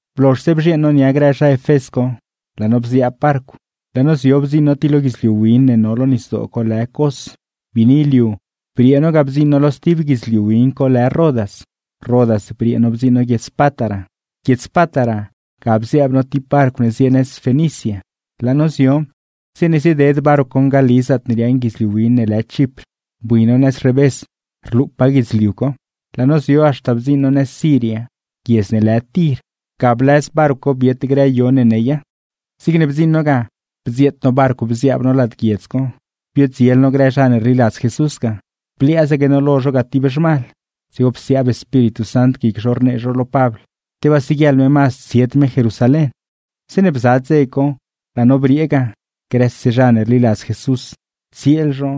Blozhse bzhieeṉ no nia grë zha Efés co, laa no bziaab barcw, laa no zio bdziṉ no ti lo guidzliu win ne no lo nisdoo co lë Cos. Biini liu briee no ga bdziṉ no lo sti guidzliu win co lë Rodas. Rodas briee no bdziṉ no guiedz Pátara. Guiedz Pátara, ga bziaab no ti barcw ne zie nëz xtan zha Fenicia. Zeeṉe zieded barcw co ngali zaatne riaaṉ guidzliu win ne lë Chipr, bui no nëz revés rlupaa guidzliu co. Laa no zio haxta bdziṉ no guiedz Tir, xtan zha Siria, ga blëz barcw co biet grë yo ne neya. Zigne bdziṉ no ga bdzieet no barcw bziaab no lad guiedz co, biodziel no grë zha ne rliladz Jesús ga; bliaazaque no lo zho ga ti zhmal. Dzigo psiaab Espíritu Sant guic zho rnee zho lo Pabl, tebaa siguieḻ me mazd tsied me Jerusalén. Zeeṉe laa no briee ga, grëse zha ne rliladz Jesús grë tsieel zho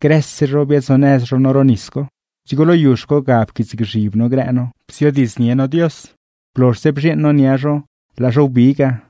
grë xpëëd zho biaad-zonëz zho no ro nis co; dzigo lo yuzh co ga pquiitsgzhib no grë no, bziodiidznie no Dios. Blozhse bzhieeṉ no nia zho, laa zho wbi ga.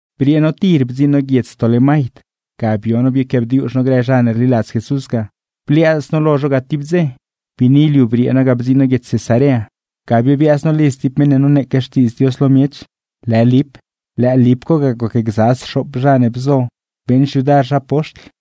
Briee no Tir bdziṉ no guiedz Tolemaid, ga bio no bioquiaabdiuzh no grë zha ne rliladz Jesús ga, bliaaz no lo zho tib dze. Biini liu briee no ga bdziṉ no guiedz Cesarea, ga biobiaaz no lidz ti meṉ ne noneeque Xtiidz Dios lo miech, lë Lip. Lëë Lip co ga gocgza sxoop zha ne bzo beeṉ xyudar zha poxtl.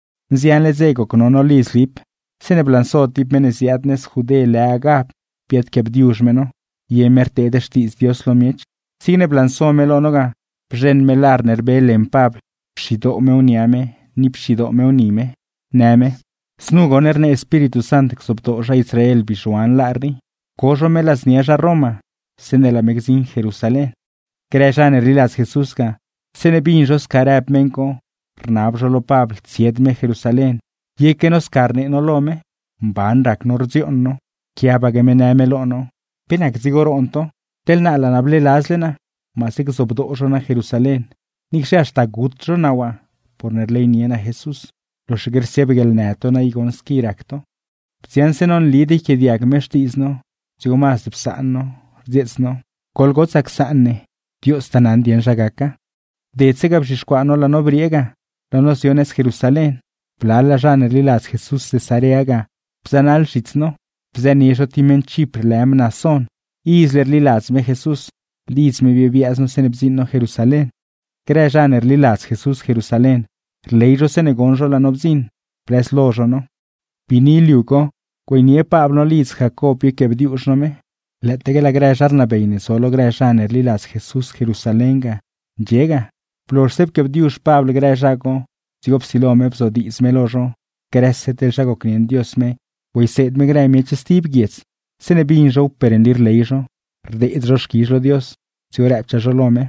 Nzianle dze goc no no lidz Lip, zeeṉe blanso ti meṉ ne ziaad nëz Judé lë Agab, biadquiaabdiuzh me no. (Ye me rnee teḻ pe nac miṉe racladz Dios gacnaṉ miech.) Zigne blanso me lo no ga, bzheṉ me lar ne rbe leṉ Pabl, pxidoo mew nia me ni pxidoo mew ni me, në me: ―Znu goṉ rnee Espíritu Sant gzobdoo zha Israel bizhuan lar rii, co zho me ladznia zha Roma zeeṉe laa me gdziṉ Jerusalén. Grë zha ne rliladz Jesús ga, zeeṉe bin zho sca rëb meṉ co, rnab zho lo Pabl tsied me Jerusalén, yeque no sca rnee lo me. Mban rac no rdzioon no. Pquiabaque me në me lo no: ―¿Pe nac dzigo roon to? Teḻ naa laa naa bleeladzle naa maase gzobdoo zho naa Jerusalén, niicxe haxta gut zho naa waa porne rleynie naa Jesús. ¡Loxaque rsiaab guieḻnë to naa i goṉ squi rac to! Bdziaṉse no nlid yquiaadiag me xtiidz no, dzigo mazd psaan no, rdzieets no: ―Goḻgotsaa csaan ne, Diostaa naṉ dieṉ zha gaca. Bdedse ga bzhixcuaa no laa no briee ga, laa no zio nëz Jerusalén; blalaa zha ne rliladz Jesús Cesarea ga bzënaḻ zhits no, bzënie zho ti meṉ Chipr lë Mnasón. Izle rliladz me Jesús, lidz me biobiaaz no zeeṉe bdziṉ no Jerusalén. Grë zha ne rliladz Jesús Jerusalén, rley zho zeeṉe goṉ zho laa no bdziṉ, blëzlo zho no. Biini liu co güeynie Pabl no lidz Jacob bioquiaabdiuzh no me, lëëtaque laa grë zha rnabey ne zo lo grë zha ne rliladz Jesús Jerusalén ga, ndxie ga. Blozhse pquiaabdiuzh Pabl grë zha co, dzigo psilo me bzodiidz me lo zho grëse zha gocnieṉ Dios me güeyseed me grë miech stib guiedz. Zeeṉe bin zhow per nli rley zho, rdeed zho xquizh lo Dios; dzigo rëbchaa zho lo me: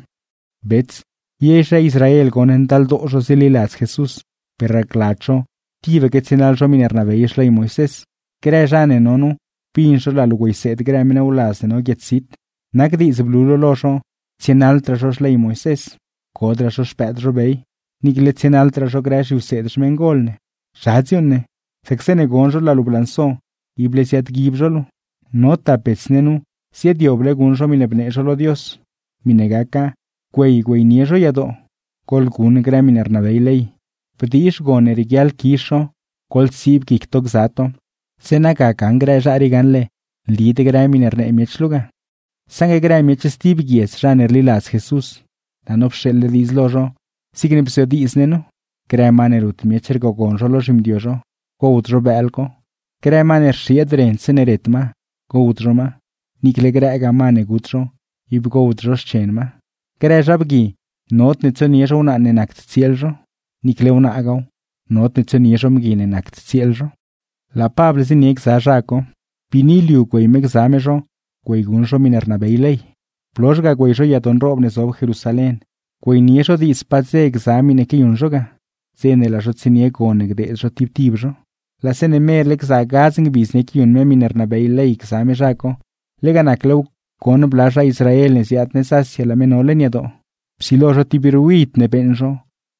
―Bets, ye zha Israel goṉ ndaldoo zho zililadz Jesús; per racladz zho tibaque tsienaḻ zho miṉe rnabey Xley Moisés. Grë zha ne no nu bin zho laa luu güeyseed grë meṉ wladz ne no guiedz zit, nac diidz blu luu lo zho tsienaḻdraa zho Xley Moisés, codraa zho xpëëd zho bey, niicle tsienaḻdraa zho grë zhiwseed xmeṉgol ne. ¿Zha gaṉle dziuuṉ ne? Sac zeeṉe gon zho laa luu blanso, ible ziaadguib zho luu. No tap bets ne nu ziaadyoble guṉ zho miṉe bnee zho lo Dios; miṉe gaca güey güeynie zho yadoo, goḻguṉ grë miṉe rnabey ley, bdiizh ctsiib guic to gza to; zeeṉa ga gaṉ grë zha rii gaṉle nlid grë miṉe rnee miech luu ga. ’Saṉgue grë miech stib guiedz zha ne rliladz Jesús, laa no pxeeḻle diidz lo zho zigne bzodiidz ne nu: grë ma ne rut miech rgogon zho lo zhimdio zho, gowd zho bëël co; grë ma ne rxieed ren zeeṉe ret ma, gowd zho ma; ni niicle grëgaa ma ne gut zho, ib gowd zho xchen ma; grë zha bgui, nodne tsonie zho wnaa ne nacd tsieel zho; niicle wnaagaaw, nodne tsonie zho mgui ne nacd tsieel zho. Laa Pabl zienie gza zha co. Biini liu güey me gza me zho güeyguṉ zho miṉe rnabey ley; blozh ga güey zho yadoo güeynie zho diidz pa dze gza miṉe quiayuṉ zho ga, zeeṉa gaḻ dze co laa zho tsienie gon ne gdeed zho tib tib zho. Laa zeeṉe merle gza gadz ngbidz ne quiayuṉ me miṉe rnabey ley ga gza me zha co, lega naclew goṉ bla zha Israel ne ziaad nëz Asia laa me no leṉ yadoo. Nacne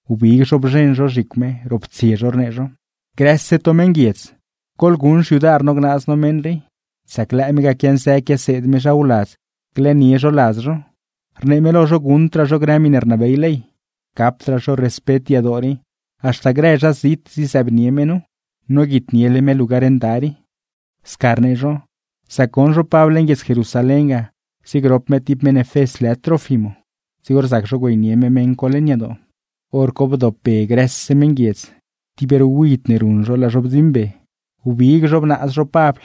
wbig zho bzheṉ zho zhicw me, roptsie zho rnee zho: ―¡Grëse to meṉguiedz! ¡Goḻguṉ xyudar no gnaaz ne meṉ rii! Sac lëë me ga quianzë quiaseed me zha wladz glëënie zho ladz zho, rnee me lo zho guṉdraa zho grë miṉe rnabey ley, gapdraa zho respet yadoo rii; haxta grë zha zit zizëëbnie me nu. ¡Noguitniele me lugar nda rii! Sca rnee zho, sac goṉ zho Pabl leṉ guiedz Jerusalén ga ziegrop me ti zha Efés lë Trófimo, dzigo rzac zho güeynie me zha co leṉ yadoo. Pe ga bin grë meṉguiedz, grëse zho bdziṉ wbigbe zho lo Pabl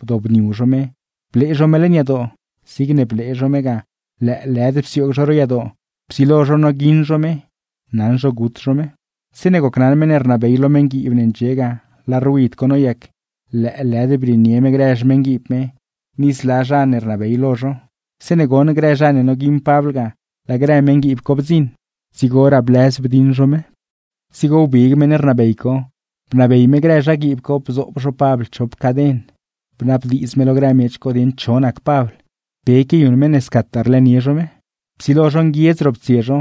bdobniu zho me blee zho me leṉ yadoo, zigne blee zho me ga lëëlëd psioog zho ro yadoo; psilo zho noguiṉ zho me, naṉ zho gut zho me. Zeeṉe gocnaṉ meṉ ne rnabey lo meṉguiib ne ndxie ga laa ruid co noyac, lëëlëd brieenie me grë xmeṉguiib me ni grëraa zha ne rnabey lo zho. Zeeṉe goṉ grë zha ne noguiṉ Pabl ga, laa grë meṉguiib co bdziṉ, dzigoraa blëz bdiṉ zho me. Dzigo wbig meṉ rnabey co, bnabey me grë zhaguiib co bzoob zho Pabl chop caden. Bnabdiidz me lo grë miech co dieṉ cho nac Pabl, pe quiayuṉ me ne scataa rlëënie zho me. Psilo zho nguiedz roptsie zho,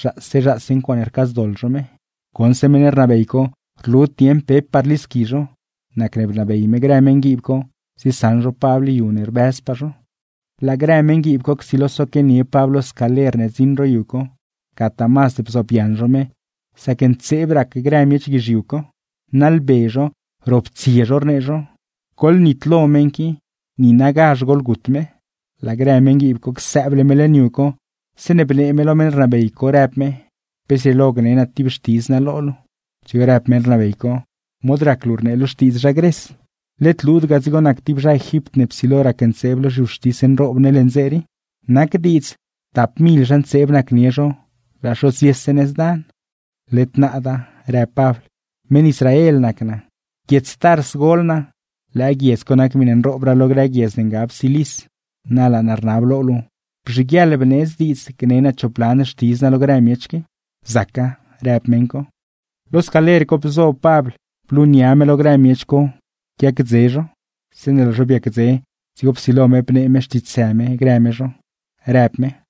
zhaase zhaase ncuaaṉe rcaadzdoḻ zho me. Goṉse meṉ rnabey co rlud dieṉ pepaa rlisqui zho, nacne bnabey me grë meṉguiib co ziesaṉ zho Pabl yu ne rbëzpaa zho. Laa grë meṉguiib co csilo soquianie Pabl lo scaler ne rdziṉ ro yu co, gataa mazd bzoobyaṉ zho me, sac ntseeb rac grë miech co; naḻbe zho, roptsie zho rnee zho: ―¡Goḻnitlogazh meṉ qui! ¡Niinagazh goḻgut me! Laa grë meṉguiib co csëëble me leṉ yu co, zeeṉe bnee me lo meṉ rnabey co, rëb me: ―¿Pe zrieelo gne naa ti xtidz naa lo luu? Dzigo rëb meṉ rnabey co: ―¿Mod rac luu rnee luu xtiidz zha Gres? ¿Led luud ga dzigo nac ti zha Egipt ne psilo racntseeb lo gobiern leṉ dze rii? Nac diidz, tap mil zha ntseeb nacnie zho, laa zho ziese nëz dan. ―Led naada ―rëb Pabl― meṉ Israel nac naa. Guiedz Tars gol naa, lëë guiedz co nac miṉe nroobraa lo grë guiedz ne ngab Cilis. Na laa naa rnab lo luu, beeṉ guieḻnzaac bneedz diidz gne naa chop lan xtidz naa lo grë miech qui. ―Zaca ―rëb meṉ co. Lo scaler co zo Pabl blunia me lo grë miech co cuedze zho. Zeeṉe laa zho biacdze, dzigo psilo me bnee me xtiitsë me grë me zho, rëb me: